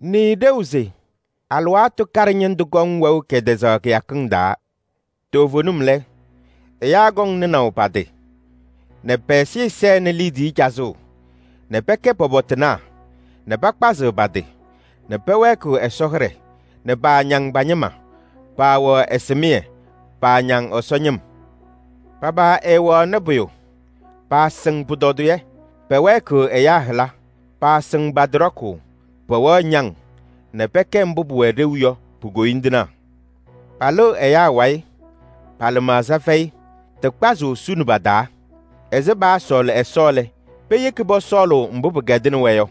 Nɩɩ ɖeu se: alɩwaatʋ kaɖɛ ñɩndʋ kɔŋ wɛʋ kɛtɛzaɣ kɩyakɩŋ taa. Toovenim lɛ, ɛyaa kɔŋ nɩnaʋ pa-tɩ nɛ pɛ-ɛzɩyɛ sɛnɩ liidiye cazʋʋ nɛ pɛkɛ pɔpɔtɩnaa nɛ pakpazɩɣ pa-tɩ nɛ pɛwɛɛkɩɣ Ɛsɔ hɩɖɛ nɛ paañaŋ pa-ñɩma, paawɛɣ ɛsɩmɩyɛ, paañaŋ Ɛsɔ ñɩm. Pa-paa ɛɛwɛɣnɩ pʋyʋ, paasɩŋ pʋtɔdɩyɛ, pɛwɛɛkɩɣ ɛyaa hɩla, paasɩŋ pa-tɩ ɖɔkʋʋ, pɛwɛɣ ñaŋ nɛ pɛkɛ mbʋ pʋwɛ ɖeu yɔ pu-koyindinaa. Palɩɣ ɛyaa wayɩ, pa-lɩmaɣza fɛyɩ, tɩ kpazʋʋ suni pa-taa. Ɛzɩ paasɔɔlɩ Ɛsɔ lɛ, peyeki pɔsɔɔlʋʋ mbʋ pɩkɛdɩnɩ-wɛ yɔ.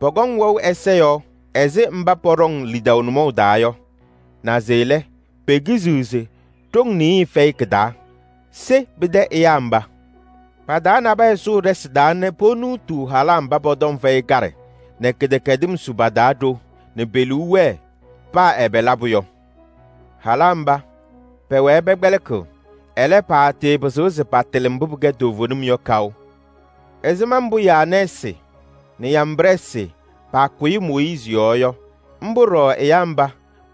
Pɔkɔŋ wɛʋ ɛza yɔɔ ɛzɩ mba pɔɖɔŋ lidaʋ nʋmɔʋ taa yɔ, naze lɛ, pekiziɣ se ɖoŋ nɩɩyɩ fɛyɩ kɩ-taa. Se pɩtɛ ɛyaa mba! Pa-taa nabɛyɛ sʋʋ ɖɩsɩ taa nɛ ponuutuu halaa mba pɔ-tɔm fɛyɩ kaɖɛ nɛ kɩdɛkɛdɩm su pa-taa ɖo nɛ pe-liu wɛɛ paa ɛbɛ labʋ yɔ. Halaa mba, pɛwɛɛ pɛkpɛlɩkɩɣ, ɛlɛ, paatɩɩpɩzɩɣ se patɩlɩ mbʋ pɩkɛ toovenim yɔ kaʋ. Ɛzɩma mbʋ Yaanɛɛsɩ nɛ Yambrɛɛsɩ paakʋyɩ Mooyiizi yɔɔ yɔ, mbʋ ɖɔɖɔ ɛyaa mba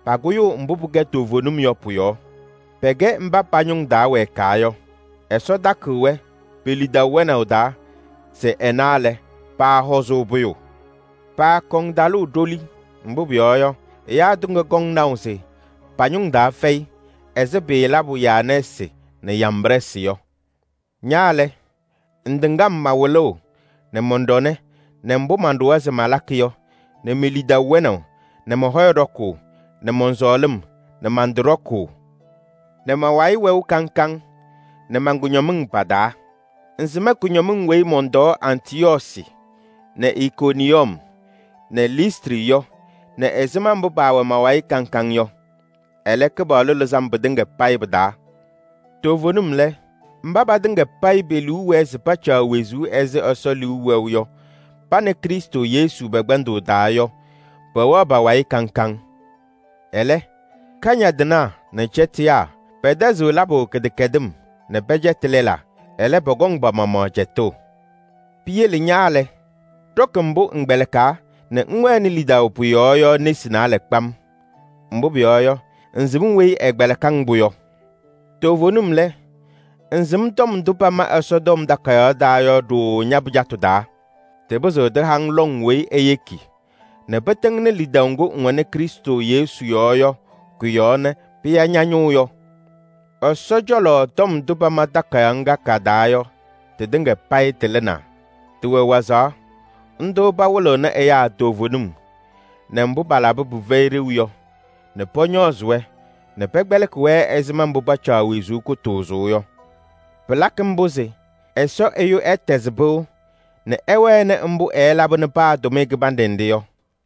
pakʋyʋʋ mbʋ pɩkɛ toovenim yɔ pʋ-yɔɔ. Pɛkɛ mba pa-ñʋŋ taa wɛɛkaa yɔ. Ɛsɔ takɩɣ-wɛ pe-lidaʋ wɛnaʋ taa se ɛna lɛ, paahɔzʋʋ pʋyʋ: paakɔŋ talʋʋ ɖoli, mbʋ pʋyɔɔ yɔ, ɛyaa tɩŋa kɔŋ naʋ se pa-ñʋŋ taa fɛyɩ ɛzɩ pɩɩlabʋ Yaanɛɛsɩ nɛ Yambrɛɛsɩ yɔ. Ña lɛ, ŋtɩŋ-m ma-wɩlʋʋ nɛ mɔn-ɖɔnɛ nɛ mbʋ manɖʋwa se malakɩ yɔ nɛ me-lidaʋ wɛnaʋ nɛ mɔ-hɔyɛ ɖɔkʋʋ nɛ mɔn-sɔɔlɩm nɛ man-tɩ ɖɔkʋʋ nɛ ma-wayɩ wɛʋ kaŋ kaŋ nɛ man-kʋñɔmɩŋ pa-taa. Ŋsɩm kʋñɔmɩŋ weyi mɔntɔɔ Antɩyɔɔsɩ nɛ Ikoniyɔm nɛ Listrɩ yɔ nɛ ɛzɩma mbʋ paawɛ ma-wayɩ kaŋ kaŋ yɔ. Ɛlɛ, Kɩpaɣlʋ lɩzɩ-m pɩtɩŋa payɩ pɩ-taa. Toovenim lɛ, mba patɩŋa payɩ pe-liu wɛɛ se pacaɣ wezuu ɛzɩ Ɛsɔ liu wɛʋ yɔ pa nɛ Krɩstʋ Yesu pɛ-kpɛndʋʋ taa yɔ, pɛwɛɣ pa-wayɩ kaŋ kaŋ. Ɛlɛ, kañadɩnaa nɛ cɛtɩyaa pɛtɛzɩɣ labʋ kɩdɛkɛdɩm nɛ pɛcɛtɩ lɛlaa, ɛlɛ pɔkɔŋ pa-maɣmaɣ cɛtʋʋ. Piyele ña lɛ, ɖɔkɩ mbʋ ŋkpɛlɩkaa nɛ ŋwɛnɩ lidaʋ pʋ-yɔɔ yɔ nesi naalɛ kpam. Mbʋ pʋyɔɔ yɔ, ŋsɩm weyi ɛkpɛlɩkɩ-ŋ-pʋ yɔ. Toovenim lɛ, ŋsɩm tɔm ndʋ pama Ɛsɔtɔm Takayaɣ taa yɔ ɖooo ña-pɩjatʋ taa. Tɩpɩzɩɣ tɩha-ŋ lɔŋ weyi eyeki nɛ pɩtɩŋnɩ lidaʋ ŋgʋ ŋwɛnɩ Krɩstʋ Yesu yɔɔ yɔ kʋ-yɔɔ nɛ pɩya ña-ñʋʋ yɔ. Ɛsɔ cɔlɔ tɔm ndʋ pama takayaɣ ŋga ka-taa yɔ, tɩtɩŋa payɩ tɩlɩnaa. Tɩwɛ wazaɣ: ndʋ pawɩlɩɣnɩ ɛyaa toovenim nɛ mbʋ palabɩ pɩfɛyɩ ɖeu yɔ nɛ pɔñɔɔzɩ-wɛ nɛ pɛkpɛlɩkɩ-wɛ ɛzɩma mbʋ pacaɣ wezuu kʋtʋʋzʋʋ yɔ. Pɩlakɩ mbʋ se Ɛsɔ ɛyʋ ɛtɛzɩ pɩʋ nɛ ɛwɛnɩ mbʋ ɛɛlabɩnɩ paa tʋmɩyɛ kɩbanɖɛ nɖɩ yɔ.